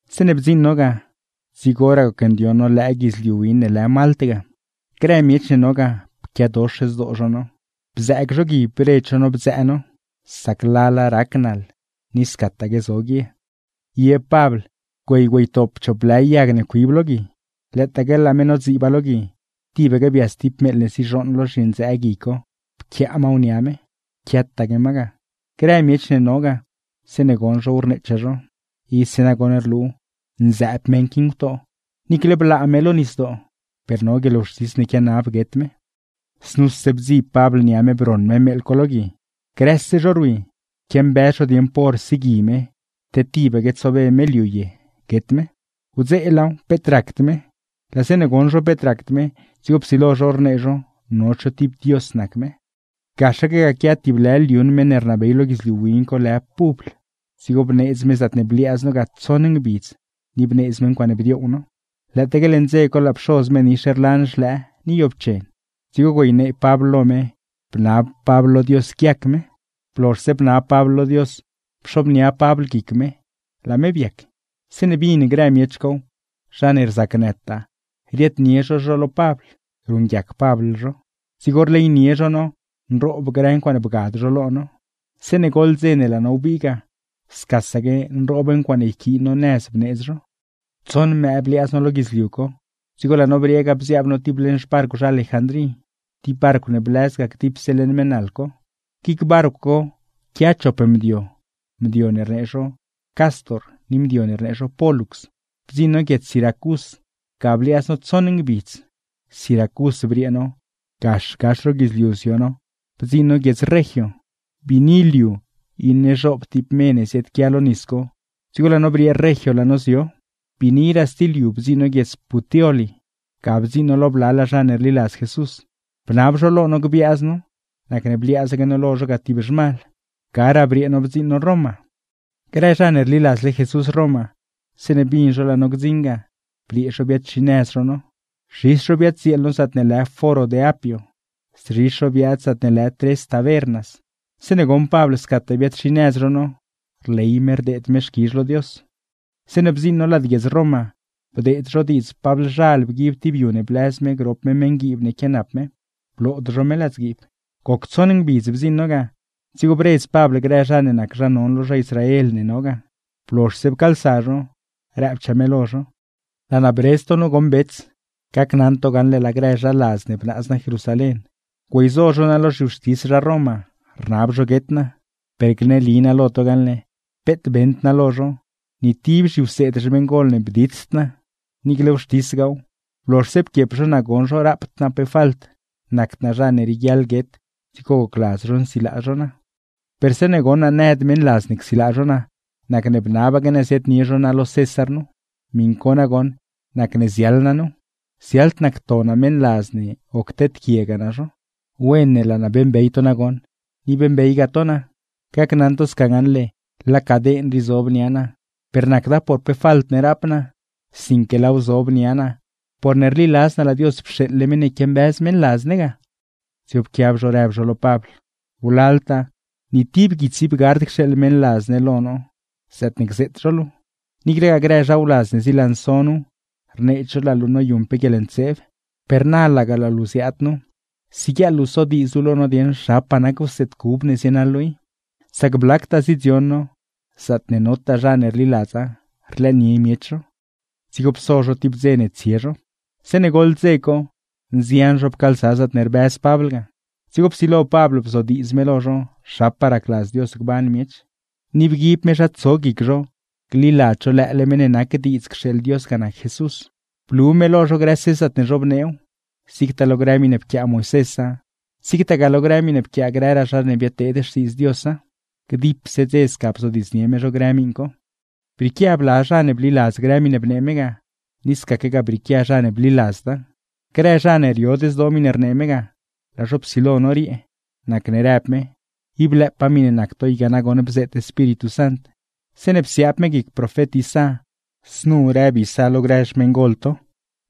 Zeeṉe bdziṉ no ga, dzigoraa gocndioṉ no lëë guidzliu win ne lë Malt ga. Grë miech ne no ga pquiadox zdoo zho no, bzëëg zho gui bredz zho no bdzëë no, sac lala rac naḻ ni scataque bgaa no guie. Ye Pabl güey güeytop chop lë yag ne cuib lo gui. Lëëtaaque laa me nodziiba lo gui, tibaque bias ti meeḻ ne zizhooṉ lo zhindzëë gui co, pquiaalay ma nia me, quiataque ma ga. Grë miech ne no ga, zeeṉe goṉ zhow rneechaa zho: ―¡Ise nagoṉ rlu, nzëëb meṉ qui ngutoo! Niicle blaa me lo nisdoo, per no guieḻwxtis ne quianab guet me. Znuse bdzib Pabl nia me broṉ me meeḻ co lo gui. Grëse zho rwi quiambëz zho dieṉ pa hor sigui me, te tibaque tsobe me liu ye guet me. Wdzeelaaw peet racd me. Laa zeeṉe goṉ zho peet racd me, dzigo psilo zho rnee zho no cho ti dios nac me. Gaxaque ga quia tib lë liuṉ meṉ ne rnabey lo guidzliu win co lë Publ, dzigo bneedz me zaatne bliaaz no ga tsoṉ ngbidz ni bneedz me ncuaaṉe bdioow no. Lëëtaaque leṉ dze co laa pxoz me nix rlan xlëë ni yoobchen. Dzigo güeynee Pabl lo me, bnab Pabl lo Dios guiac me; blozhse bnab Pabl lo Dios, pxobnia Pabl guic me, laa me biac. Zeeṉe bin grë miech cow, zha ne rzacnëtaa riaadnie zho zho lo Pabl, ruṉguiac Pabl zho. Dzigo rleynie zho no, nroob grë ncuaaṉe bgad zho lo no. Zeeṉe goḻ dze ne laa no wbii ga, scasaque nroob ncuaaṉe yquiin no nëz bneedz zho. Tsoṉ mëë bliaaz no lo guidzliu co, dzigo laa no briee ga bziaab no ti leṉ xbarcw zha Alejandrí, ti barcw ne blëz ga dipse leṉ mëë naḻ co. Guic barcw co quia chop mdio, mdio ne rnee zho Cástor ni mdio ne rnee zho Pólux. Bdziṉ no guiedz Siracús, ga bliaaz no tsoṉ ngbidz. Siracús briee no, gax gax ro guidzliu zio no bdziṉ no guiedz Regio; biini liu iṉe zhoob ti me ne ziaadquia lo nis co, dzigo laa no briee Regio laa no zio. Biiniraa sti liu bdziṉ no guiedz Puteoli, ga bdziṉ no lo blalaa zha ne rliladz Jesús. Bnab zho lo no gbiaaz no, nacne bliaazaque no lo zho ga ti zhmal. Garaa briee no bdziṉ no Roma. Grë zha ne rliladzle Jesús Roma, zeeṉe bin zho laa no gdziṉ ga, briee zho biaad-xinëz zho no. Zhis zho biaddzieel no zaatne lë Foro de Apio, szhis zho biaad zaatne lë Tres Tabernas. Zeeṉe goṉ Pabl scataa biaad-xinëz zho no, rley me rdeed me xquizh lo Dios. Zeeṉe bdziṉ no lad guiedz Roma, bdeed zho diidz Pablzhal bguib ti yu ne blëz me grop me meṉguiib ne quianap me, blood zho me ladzguiib. Goc tsoṉ ngbidz bdziṉ no ga, dzigo bredz Pabl grë zha ne nac zha non lo zha Israel ne no ga. Blozhse pcaalsa zho, rëbchaa me lo zho: ―Laa naa bredz to nu goṉ bets, gacnaṉ to gaṉle laa grë zha ladz ne bnaaz naa Jerusalén, güeyzo zho naa lo zhiwxtis zha Roma rnab zho guet naa, per gneli naa lo to gaṉle, peet beṉd naa lo zho, ni ti zhiwseed xmeṉgol ne bditsd naa. Niicle wxtisgaaw, blozhse pquiep zho naa goṉ zho raapd naa falt, nacd naa zha ne rieguiaḻ guet; dzigo gocladz zho nsilaa zho naa. ’Per zeeṉe goṉ naa nëd meṉladz ne csilaa zho naa, nacne bnabaque naa ziaadnie zho naa lo César nu. Miṉ co nagoṉ nacne ziaḻ naa nu, ziaḻd naa cto naa meṉladz ne o cteedquiegaa naa zho. Wen ne laa naa beeṉbey to nagoṉ, ni beeṉbeygaa to naa; gacnaṉ to sca gaṉle laa caden rii zob nia naa, per nacda por pe falt ne rap naa, sinque laaw zob nia naa porne rliladz naa laa Dios pxeeḻle meṉ ne quiambëz meṉladz ne ga. Dzigo pquiab zho rëb zho lo Pabl: ―¡Wlaltaa, ni ti guits ib gard cxeeḻ meṉladz ne lo no zaatne gzeet zho luu! Niiclegaa grë zha wladz ne zilanso nuw, rneed zho laa luu noyuṉ pe guieḻntseeb. Per na laga laa luu ziaad nu, siguieḻ luu sodiidz luu lo no dieṉ zhapaa nac wseed ne rliladz luu i, sac blactaa zidzion no, zaatne notaa zha ne rliladza rlëënie miech zho. Dzigo pso zho ti dze ne tsie zho. Zeeṉe goḻ dze co, nzian zho pcaalsa zaatne rbëz Pabl ga. Dzigo psilo Pabl bzodiidz me lo zho zhapaa racladz Dios gban miech, ni rnee me lo zho gliladz zho lëële meṉ ne nac diidz cxeeḻ Dios ga nac Jesús; blu me lo zho grëse zaatne zhobneew, zigtaa lo grë miṉe pquiaa Moisésa, zigtagaa lo grë miṉe pquiaa grëraa zha ne biadteed xtiidz Diosa. Dipse dze sca bzodiidznie me zho grë miṉ co. Brieequia bla zha ne bliladz grë miṉe bnee me ga, ni scaquegaa brieequia zha ne bliladzda. Grë zha ne riod zdoo miṉe rnee me ga, laa zho psilo noriee, nacne rëb me: ―Ib lëëpaa miṉe nac to i ga nagoṉ bzeet Espíritu Sant, zeeṉe psiaab me guic profet Isá znu rëb Isá lo grë xmeṉgol to: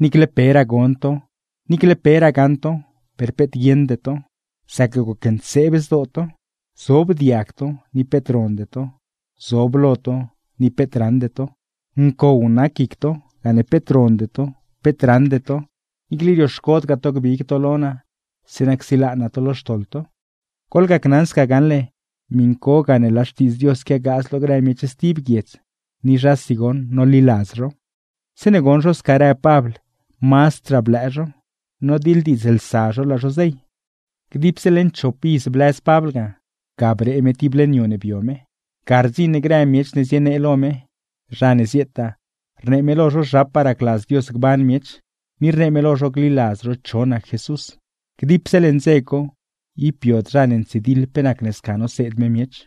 Niicle peraa gon to, niicle peraa gaṉ to, per peet guieṉde to; sac gocntseeb zdoo to. Zob diag to, ni peet ronde to; zob lo to, ni peet raṉde to. Ncow nac guic to, gane peet ronde to, peet raṉde to; niicle rioxcodgaa to gbig to lo naa zeeṉa csilaa naa to lo xtoḻ to. Goḻgacnaṉ sca gaṉle, miṉ co gane laa Xtiidz Dios quiagaaz lo grë miech stib guiedz, ni zhasi goṉ noliladz zhow. [Zeeṉe goṉ zho sca rëb Pabl mazdraa blëë zho, nodiḻdiidzlsa zho laa zho zey.] Dipse leṉ chop iz blëz Pabl ga, ga bree me ti leṉ yu ne bio me. Ga rdziṉ grë miech ne zienee lo me, zha ne zietaa, rnee me lo zho zhapaa racladz Dios gban miech, ni rnee me lo zho gliladz zho cho nac Jesús. Dipse leṉ dze co, ib biod zha ne ntsidiḻ pe nacne sca noseed me miech.